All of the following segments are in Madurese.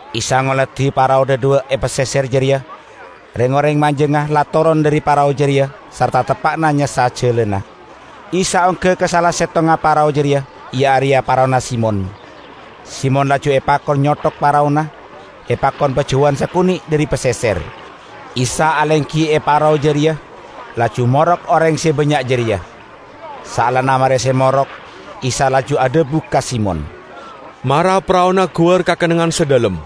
Isa ngoladi parao dhadhuwa' e paseser jareya; reng-oreng majangnga la toron dhari parao jareya sarta teppa'na nyassa jalana. Isa ongga ka sala settongnga parao jareya, iya areya paraona Simon. Simon laju epakon nyothok paraona, epakon pajauwan sakone' dhari paseser. Isa alenggi e parao jareya, laju morok oreng se bannya' jareya. Saellana mare se morok, Isa laju adhabu ka Simon, "Mara paraona guwar ka kennengngan se dhalem,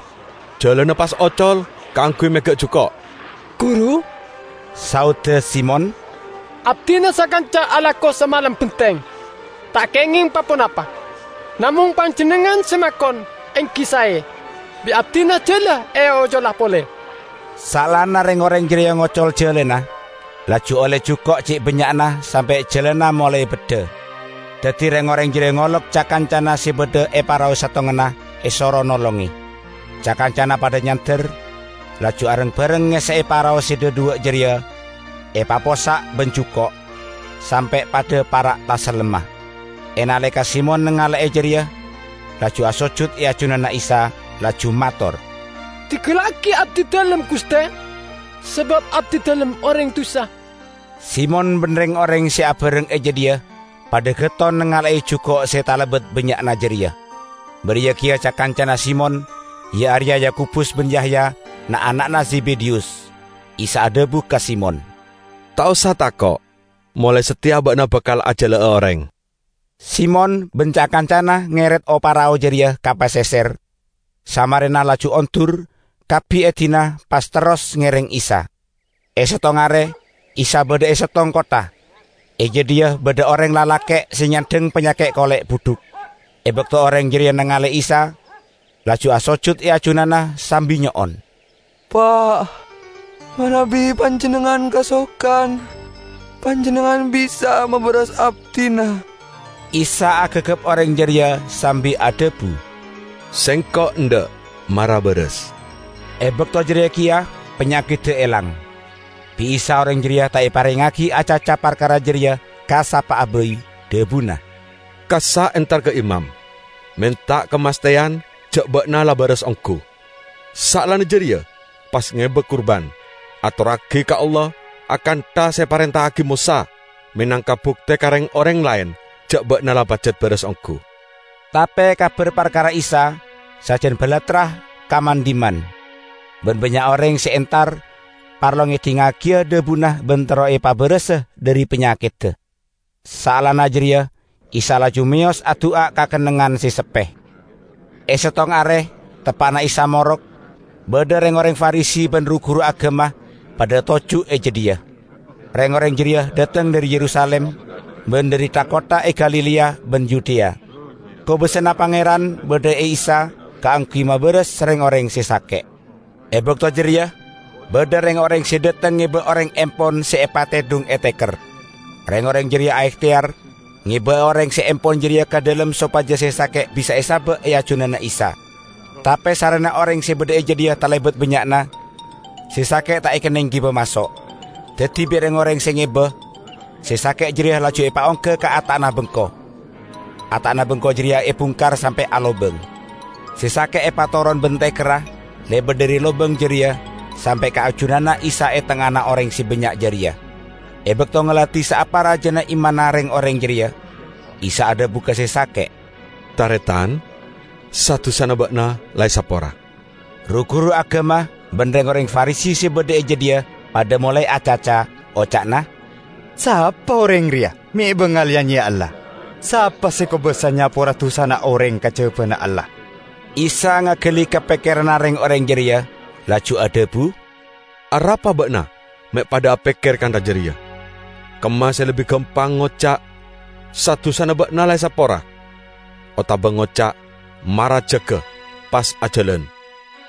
jalana pas ocol kaangguy mega' juko'." "Guru," saodda Simon, "abdina sakanca alako samalem benteng, ta' kengeng pa-ponapa! Namong Panjennengngan se makon, enggi sae; bi' abdina jala eocola pole." Saellana reng-oreng jareya ngocol jalana, laju olle juko' ce' bannya'na sampe' jalana molae beddha. Daddi reng-oreng jareya ngolok ca-kancana se badha e parao settonganna, esoro nolonge. Ca-kancana padha nyander, laju areng-bareng ngesse'e parao se dhadhuwa' jareya epapossa' ban juko', sampe' padha para' tasellemma. E naleka Simon nangale'e jareya, laju asojud e ajunanna Isa, laju mator, "Dinggallagi abdidalem, Guste! Sabab abdidalem oreng dusa!" Simon ban reng-oreng se abareng e jadhiya padha getton nangale'e juko' se talebat bannya'na jareya. Bariya keya ca-kancana Simon, iya areya Yakobus ban Yahya, na'-ana'na Zebedeyus. Isa adhabu ka Simon, "Ta' osa tako'! Molae sateya ba'na bakal ajala'a oreng." Simon ban ca-kancana ngeret o-parao jareya ka paseser, samarena laju ondur, kabbi edina, pas terros ngereng Isa. E settong are, Isa badha e settong kottha. E jadhiya badha oreng lalake' se nyandhang panyaket kole' budhuk. E bakto oreng jareya nangale Isa, laju asojud e ajunanna sambi nyo'on, "Pa', manabi Panjennengngan kasokan, Panjennengngan bisa mabaras abdina!" Isa agagap oreng jareya sambi adhabu, "Sengko' endha', mara baras!" E bakto jareya keya panyakedda elang. Bi' Isa oreng jareya ta' eparengngagi acaca parkara jareya ka sapa'a bai, dhabuna, "Kassa' entar ka imam, menta kamastheyan ja' ba'na la baras onggu. Saellana jareya pas ngeba kurban, atorragi ka Allah akantha se eparenta'agi Mosa, menangka bukte ka reng-oreng laen ja' ba'na la pajat baras onggu." Tape kabar parkara Isa sajan balattra ka man-dhimman, ban bannya' oreng se entar parlo ngedhingngagiya dhabuna ban terro epabarasa dhari panyakedda. Saellana jareya Isa laju meyos adu'a ka kennengngan se seppe. E settong are teppa'na Isa morok, badha reng-oreng Farisi ban ru-guru agama padha toju' e jadhiya. Reng-oreng jareya dhateng dhari Yerusalim, ban dhari tha-kottha e Galilea ban Yudea. Kobasana Pangeran badha e Isa kaangguy mabaras reng-oreng se sake'. E bakto jareya badha reng-oreng se dhateng ngeba oreng empon se epatedhung e teker. Reng-oreng jareya aehteyar ngeba'a oreng se empon jareya ka dhalem sopaja se sake' bisa esaba' e ajunanna Isa. Tape sarrena oreng se badha e jadhiya talebat bannya'na, se sake' ta' ekenneng giba maso'. Daddi bi' reng-oreng se ngeba, se sake' jareya laju epaongga ka ata'na bengko. Ata'na bengko jareya ebungkar sampe' alobang. Se sake' epatoron ban tekerra lebat dhari lobang jareya sampe' ka ajunanna Isa e tengngana oreng se bannya' jareya. E bakto ngoladi saapa rajana imanna reng-oreng jareya, Isa adhabu ka se sake', "Taretan, sa-dusana ba'na la esapora." Ru-guru agama ban reng-oreng Farisi se badha e jadhiya padha molae acaca, oca'na, "Sapa oreng reya me' bangal ya-nyeya Allah? Sapa se kobasa nyapora dusana oreng kajabana Allah?" Isa ngagali ka pekkeranna reng-oreng jareya, laju adhabu, "Arapa ba'na me' padha apekker kantha jareya? Kemma se lebbi gampang, ngoca', 'Sa-dusana ba'na la esapora', otaba ngoca', 'Mara jaga pas ajalan!'?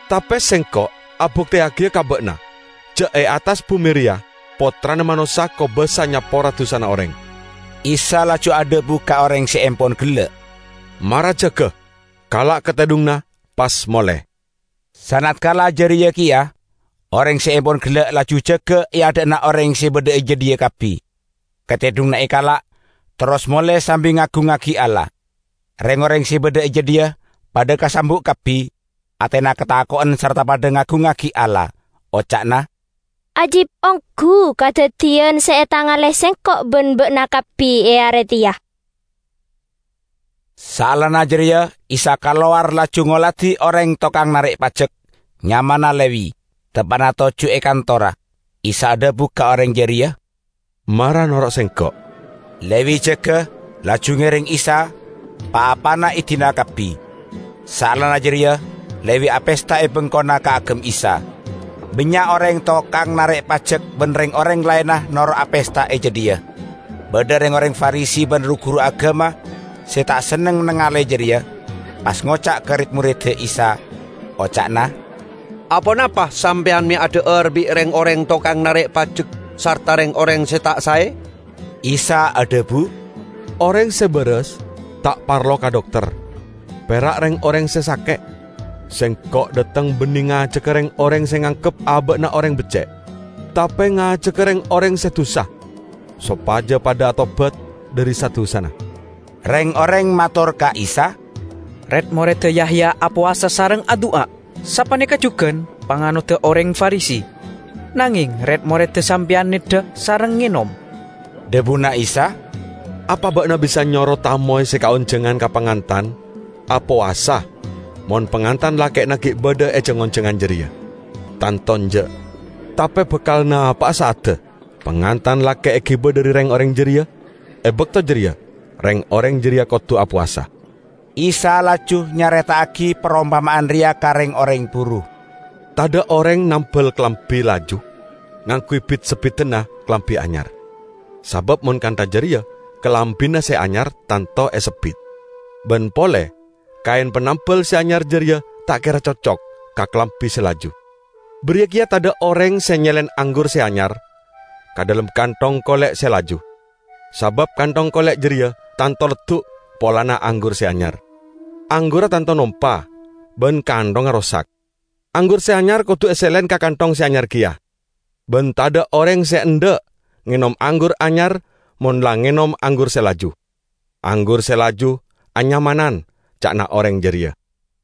Tape Sengko' abukteyagiya ka ba'na ja' e attas bume reya Pottrana Manossa kobasa nyapora dusana oreng." Isa laju adhabu ka oreng se empon gella', "Mara jaga, kala' katedhunganna, pas mole!" Sanatkala jareya keya oreng se empon gella' laju jaga e adha'na oreng se badha e jadhiya kabbi. Katedhunganna ekala', terros mole sambi ngagungngagi Allah. Reng-oreng se badha e jadhiya padha kasambu' kabbi, atena katako'en sarta padha ngagungngagi Allah, oca'na, "Ajib onggu kadaddiyan se etangale sengko' ban ba'na kabbi e are teya!" Saellana jareya Isa kalowar laju ngoladi oreng tokang narek pajek, nyamana Lewi, teppa'na toju' e kantorra. Isa adhabu ka oreng jareya, "Mara noro' Sengko'." Lewi jaga, laju ngereng Isa, pa-apana edina kabbi. Saellana jareya Lewi apesta e bengkona kaagem Isa. Bannya' oreng tokang narek pajek ban reng-oreng laenna noro' apesta e jadhiya. Badha reng-oreng Farisi ban ru-guru agama se ta' senneng nangale jareya, pas ngoca' ka red-moredda Isa, oca'na, "Aponapa sampeyan me' adha'ar bi' reng-oreng tokang narek pajek sarta reng-oreng se ta' sae?" Isa adhabu, "Oreng se baras ta' parlo ka dokter; pera' reng-oreng se sake'. Sengko' dhateng banne ngajaga reng-oreng se nganggep aba'na oreng becce', tape ngajaga reng-oreng se dusa, sopaja padha atobat dhari sa-dusana." Reng-oreng mator ka Isa, "Red-moredda Yahya apowasa sareng adu'a, sapaneka jugan panganodda oreng Farisi. Nangeng red-moredda Sampeyan neddha sareng ngenom." Dhabuna Isa, "Apa ba'na bisa nyoro tamoy se kaonjangan ka pangantan apowasa mon pangantan lake'na gi' badha e jang-onjangan jareya? Tanto enja'! Tape bakal napa'a sa'adda pangantan lake' egiba dhari reng-oreng jareya. E bakto jareya reng-oreng jareya kodu apowasa." Isa laju nyareta'agi parompama'an reya ka reng-oreng buru, "Tadha' oreng nambal kalambi laju ngangguy bit-sebbidanna kalambi anyar. Sabab mon kantha jareya kalambina se anyar tanto esebbit. Ban pole, kaen panambal se anyar jareya ta' kera cocok ka kalambi se laju. Bariya keya tadha' oreng se nyelen anggur se anyar ka dhalem kanthong kole' se laju, sabab kanthong kole' jareya tanto leddu' polana anggur se anyar. Anggurra tanto nompa ban kanthongnga rosak. Anggur se anyar kodu eselen ka kanthong se anyar keya. Ban tadha' oreng se endha' ngenom anggur anyar mon la ngenom anggur se laju. 'Anggur se laju anyamanan,' ca'na oreng jareya."